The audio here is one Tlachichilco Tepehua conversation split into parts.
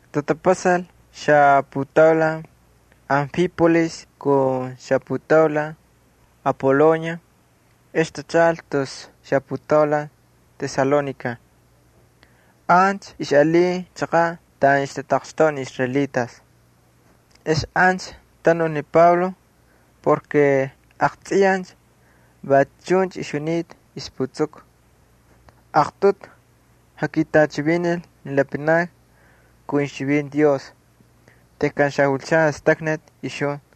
Tatapasal xaputaulan Anfípolis kun xaputaulan Apolonia, ex tachaꞌal tus xaputaulan Tesalónica. Ancha ixꞌalin chaqaꞌ taꞌan ixtataqxtoꞌa ni israelitas. Ex ancha tanul ni Pablo porke aqtsꞌiyaj va chuncha ixjunita ixputsuku. Aqtꞌutu jakitꞌachivinil ni lapanakni kun ixchivinti Dios tejkan xajulchan jastaknati ixjun.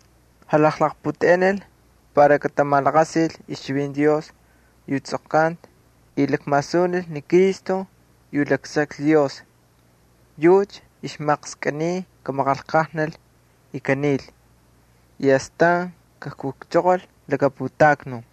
Jalaqputeꞌenil para katamalaqasil ixchivinti Dios yu tsꞌoqkanta y lakmasunil ni Cristo yu laksaklhi Dios yucha ixmaqskꞌiniy kamaqanlqajnal y kanil y astan kakujchoqol laka putaknun.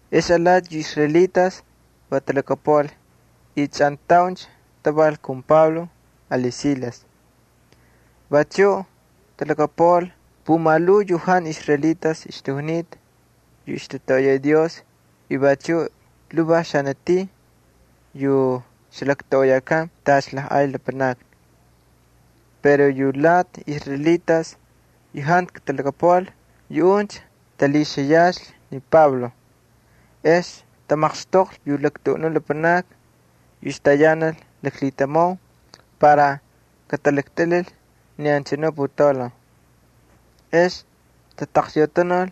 Ex lati yu israelitas va talhakapuꞌal y chꞌantauncha taval kun Pablo ali Silas. Vachuꞌ talhakapuꞌal pumalhuu yu jantu israelitas ixtajunita yu ixtatoꞌoyay Dios y vachuꞌ lhuvaj xanatin yu ixlaktoꞌoyakan tacha lajꞌay lapanakni. Pero yu alati israelitas yu jantu katalhakapuꞌal yuꞌuncha talhixiyaxlhi ni Pablo. Ex tamaqxtoqlhi yu talaktuꞌunun lapanakni yu ixtayanal laklhitamau para katalaktꞌilhil ni anchanu putaulan. Ex tatakyautanul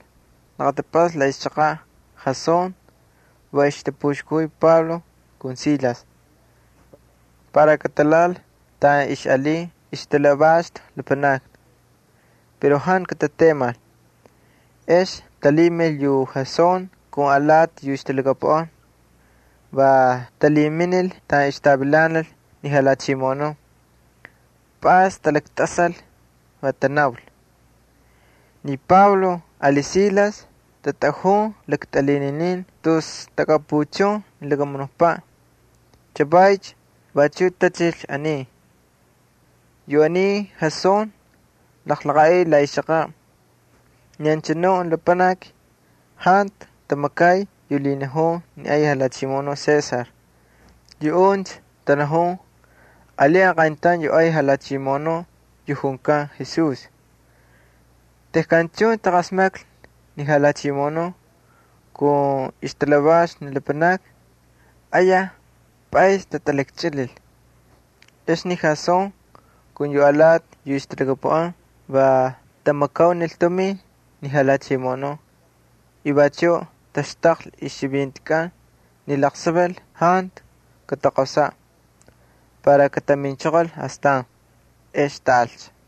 laqatapꞌasta la ixchaqaꞌ Jasón, va ixtapuxkajuy Pablo ali Silas, para katalhaꞌal taꞌan ixꞌalin ixtalhavaxtu lapanakni. Pero jantu katatemal. Ex talhimil yu Jasón kun alati yu ixtalhakapuꞌan, va talhiminil taꞌan ixtavilanal ni jalhachimoꞌonun. Pꞌays talaktꞌasal, va tanaul: —Ni Pablo ali Silas tatꞌajun lakltꞌilhinin tus taꞌakapuchun ni lakamunukpaꞌ, chavaycha vachuꞌ tachil aniy. Yu aniy Jasón jalaqaꞌil la ixchaqaꞌ. Ni anchanu lapanakni jantu tamakay yu lhinajun ni ay jalhachimoꞌonuꞌ César. Yuꞌuncha tanajun alin aqayntaun yu ay Jalhachimoꞌonuꞌ yu junkan Jesús. Tejkan chuncha taqasmaklhi ni jalhachimoꞌonun kun ixtalhavaxtu ni lapanakni, ayaj pꞌaysni tatalakchꞌilil. Ex ni Jasón kun yu alati yu ixtalhakapuꞌan va tamakaunil tumin ni jalhachimoꞌonun y vachuꞌ taxtaqlhi ixchivintikꞌan ni laqsaval jantu kataqosaꞌ, para kataminchoqol astan. Ex taꞌalcha.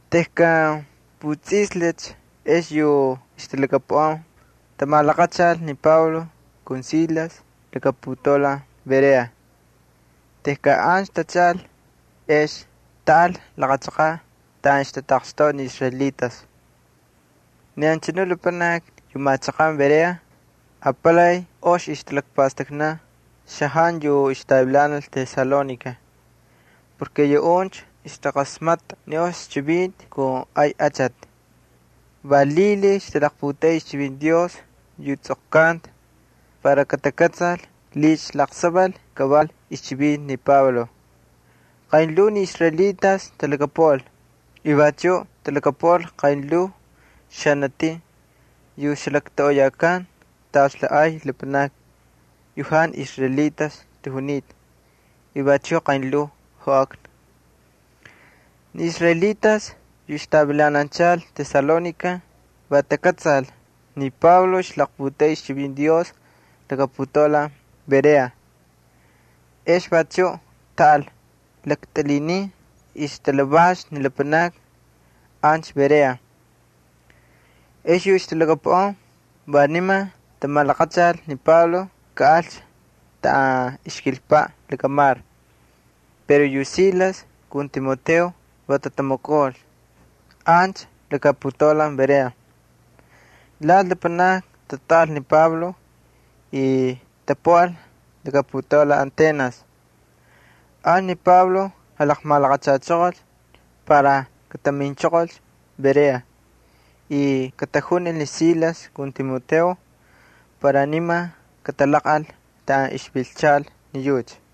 Tejkan putsꞌislhicha ex yu ixtalhakapuꞌan tamalaqachal ni Pablo ali Silas laka putaulan Berea. Tejkan ancha tachaꞌal, ex taꞌal laqa chaqaꞌ taꞌan ixtataqxtoꞌa ni israelitas. Ni anchanu lapanakni yu machaqan Berea apalay ox ixtalakpastaknan xajantu yu ixtavilanal Tesalónica porke yuꞌuncha ixtaqasmatꞌa ni ox chivinti kun ay achati. Va lhilhiy ixtaputeꞌey ixchivinti Dios yu tsꞌoqkanta para katakꞌatsal licha laqsaval kaval ixchivinti ni Pablo. Qaynlhuu ni israelitas talhakapuꞌal y vachuꞌ talhakapuꞌal qaynlhuu xanatin yu ixlaktoꞌoyakan tacha lajꞌay lapanakni yu jantu israelitas ixtajunita y vachuꞌ qaynlhuu joꞌakna. Ni israelitas yu ixtavilananchal Tesalónica va takꞌatsal ni Pablo ixlaqputeꞌey ixchivinti Dios laka putaulan Berea. Ex vachuꞌ taꞌal laktꞌilhinin ixtalhavaxtu ni lapanakni ancha Berea. Ex yu ixtalhakapuꞌan va niman tamalaqachal ni Pablo kaꞌalcha taꞌan ixkilpaꞌ lakamar pero yu Silas kun Timoteo va tatamakaul ancha laka putaulan Berea. Lati lapanakni tatꞌaꞌal ni Pablo y tapuꞌal laka putaulan Atenas. Ancha ni Pablo jalaqmalaqachachoqolcha para kataminchoqolcha Berea y katajunil ni Silas kun Timoteo para niman katalaqꞌal taꞌan ixvilchal ni yucha.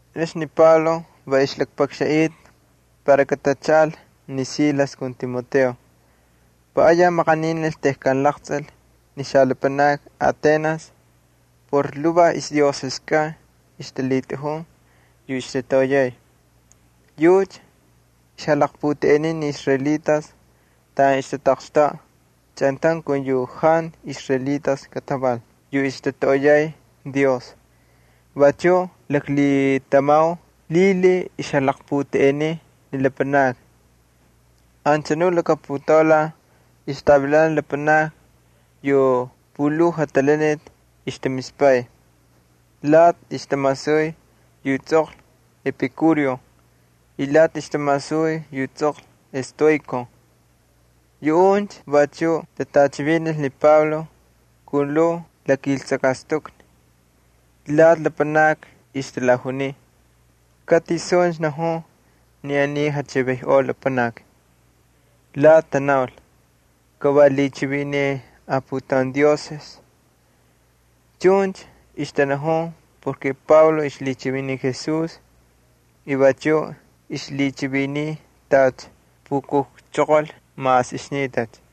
Ex ni Pablo va ixlakpakxanꞌita para katachaꞌal ni Silas kun Timoteo. Va ayaj maqaninil tejkan laqtsꞌil ni xalapanakni Atenas por lhuvaj ixdioseskꞌan ixtalhitꞌajun yu ixtatoꞌoyay. Yucha ixjalaqputeꞌeniy ni israelitas taꞌan ixtataqxtoꞌa chꞌantaun kun yu jantu israelitas kataval yu ixtatoꞌoyay Dios. Vachuꞌ laklhitamau lhilhiy ixjalaqputeꞌeniy ni lapanakni. Anchanu laka putaulan ixtavilanal lapanakni yu pulhuu jatalaniti ixtamispay, lati ixtamasuy yu tsꞌoqlhi ni Epikúreo y lati ixtamasuy yu tsꞌoqlhi Estoiko. Yuꞌuncha vachuꞌ tatꞌachivinil ni Pablo kun lhuu lakiltsakꞌastukni. Lati lapanakni ixtalajuniy: —¿Ka tisuncha najun ni aniy jachivinꞌoj lapanaki? Lati tanaul: —Ka va lhichiviniy aputaun dioses. Chuncha ixtanajun porke Pablo ixlhichiviniy Jesús y vachuꞌ ixlhichiviniy tacha pukujchoqol mas ixnitacha.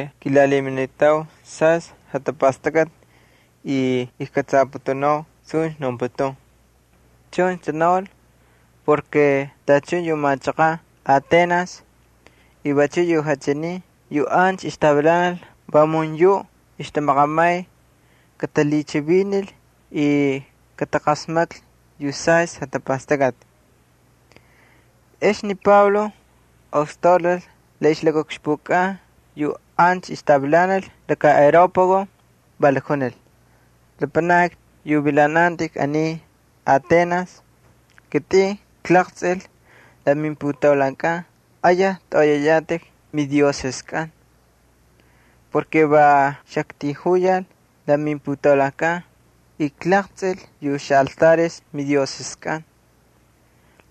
Kilalhiminitau saystꞌi jatapastakꞌati y ijkꞌatsaputunau suncha naunputun. Chuncha tanaul porke tachun yu machaqan Atenas y vachuꞌ lapanakni yu alakataun machaqan yu ancha ixtavilanal vamun yuꞌ ixtamaqamay katalhichivinil y kataqasmaklhi yu saystꞌi jatapastakꞌati. Ex ni Pablo ostaulal la ixlakaꞌukxpukꞌan yu ancha ixtavilanal laka Areópago. Va lakjunil: —Lapanakni yu vilanantꞌik aniy Atenas. Kitꞌin klaqtsꞌil la mimputaulankꞌan ayaj tꞌoꞌoyayatꞌik midioseskꞌan. Va xaktijuyal la mimputaulankꞌan y klaqtsꞌil yu xaꞌaltares midioseskꞌan.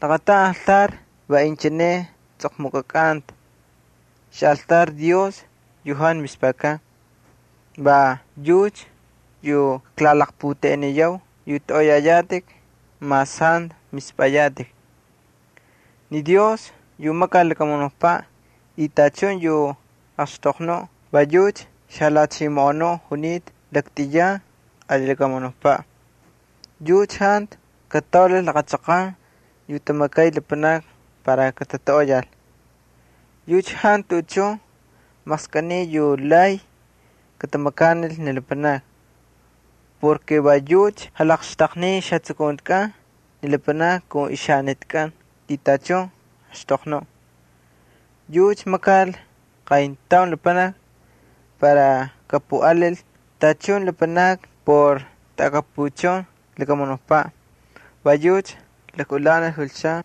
Laqataun altar va inchine tsꞌoqmukꞌakanta: “XAꞌALTAR DIOS YU JANTU MISPAKAN.” Va yucha yu kaklalaqputeꞌeniyau yu tꞌoꞌoyayatꞌik mas jantu mispꞌayatꞌik. ’Ni Dios yu makal ni lakamunukpaꞌ y tachun yu axtoqnuꞌ va yucha xaJalhachimoꞌonuꞌ junita laktꞌiyan ali lakamunukpaꞌ. Yucha jantu kataulal laqa chaqan yu tamakay lapanakni para katatoꞌoyal. Yucha jantu tuꞌuchun maqskꞌiniy yu lay katamakanil ni lapanakni. Va yucha jalaqxtaqniy ixjatsukuntikꞌan ni lapanakni kun ixjaxanitikꞌan y tachun axtoqnuꞌ. ’Yucha makal qayntaun lapanaki para kapuꞌalil tachun lapanakni por taꞌakapuchun lakamunukpaꞌ. Va yucha lakꞌulanil julchan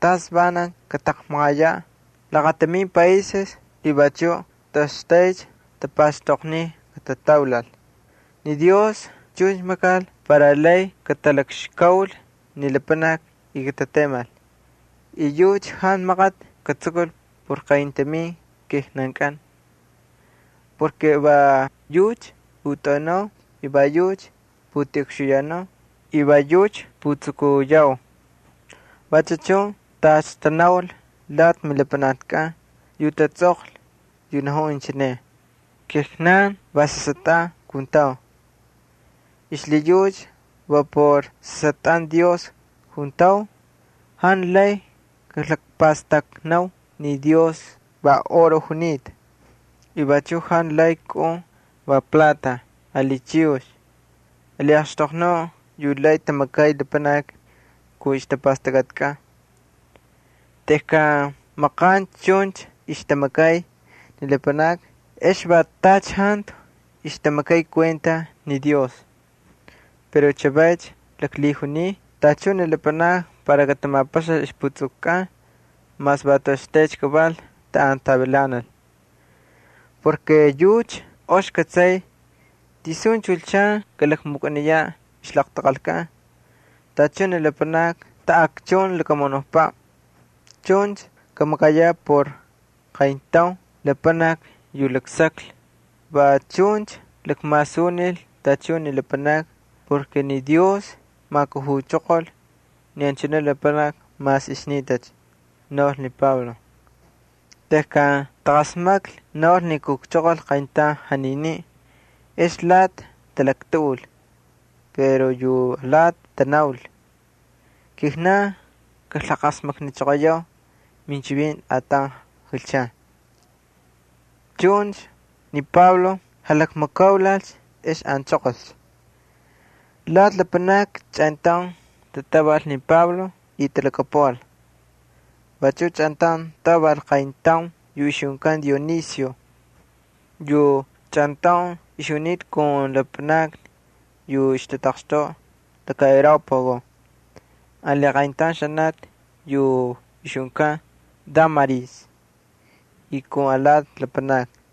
tas vanancha kataqmaqayaꞌ laqatamin paises y vachuꞌ toꞌoxtaycha tapaxtoqniy katataulal. Ni Dios chuncha makal va para lay katalakxkaul ni lapanakni y katatemal. Yucha jantu maqati katsukul por qayntamin kijnankꞌan. Va yucha putꞌaunau y va yucha putiꞌukxuyanau y va yucha putsukuyau. Vachu chun tacha tanaul lati milapanaknikꞌan yu tatsꞌoqlhi, yu najun inchine: “Kijnan va sasꞌatꞌan juntau.” Xlhiyucha va por sasꞌatꞌan Dios juntau, jantu maqskꞌiniy kalakpastakvi ni Dios va oro junita, y vachuꞌ jantu plata ali chiyux ali axtoqnuꞌ yu lay tamakay lapanakni Kun ixjatapastakꞌatkꞌan. Tejkan maqancha chuncha ixtamakay ni lapanakni ex va tacha jantu ixtamakay kuenta ni Dios. Pero chavaycha laklhijuniy tachun ni lapanakni para katamapaxal ixjatapastakꞌatkꞌan mas va toꞌoxtaycha kaval taꞌan tavilanal. Yucha ox kꞌatsay tisuncha julchan vas kalakmukꞌaniyaꞌ ixlaqtaqalkꞌan tachun ni lapanakni taꞌakchun ni lakamunukpaꞌ. Chuncha kamakayaꞌ por qayntaun lapanaki yu laksaklhi. Va chuncha lakmasunil tachun ni lapanakni porke ni Dios majkujuchoqol ni anchanu lapanaki mas ixnitacha —naul ni Pablo. Tejkan taqasmaklhi va naul ni kujchoqol qayntaun janiniꞌ ex lati talaktuꞌul, pero yu alati tanaul: —Kijnan kaklaqasmaknichoqoyau minchivinti ataun julchan. Chuncha ni Pablo jalakmakaulalcha ex anchoqolcha. Lati lapanakni chꞌantaun tatꞌaval ni Pablo y talhakapuꞌal. Vachuꞌ chꞌantaun tꞌaval qayntaun yu ixjunkan Dionisio yu chꞌantaun ixjunita kun lapanakni yu ixtataqxtoꞌa Areópago ali qayntaun xanati yu ixjunkan Dámaris ali alati lapanakni.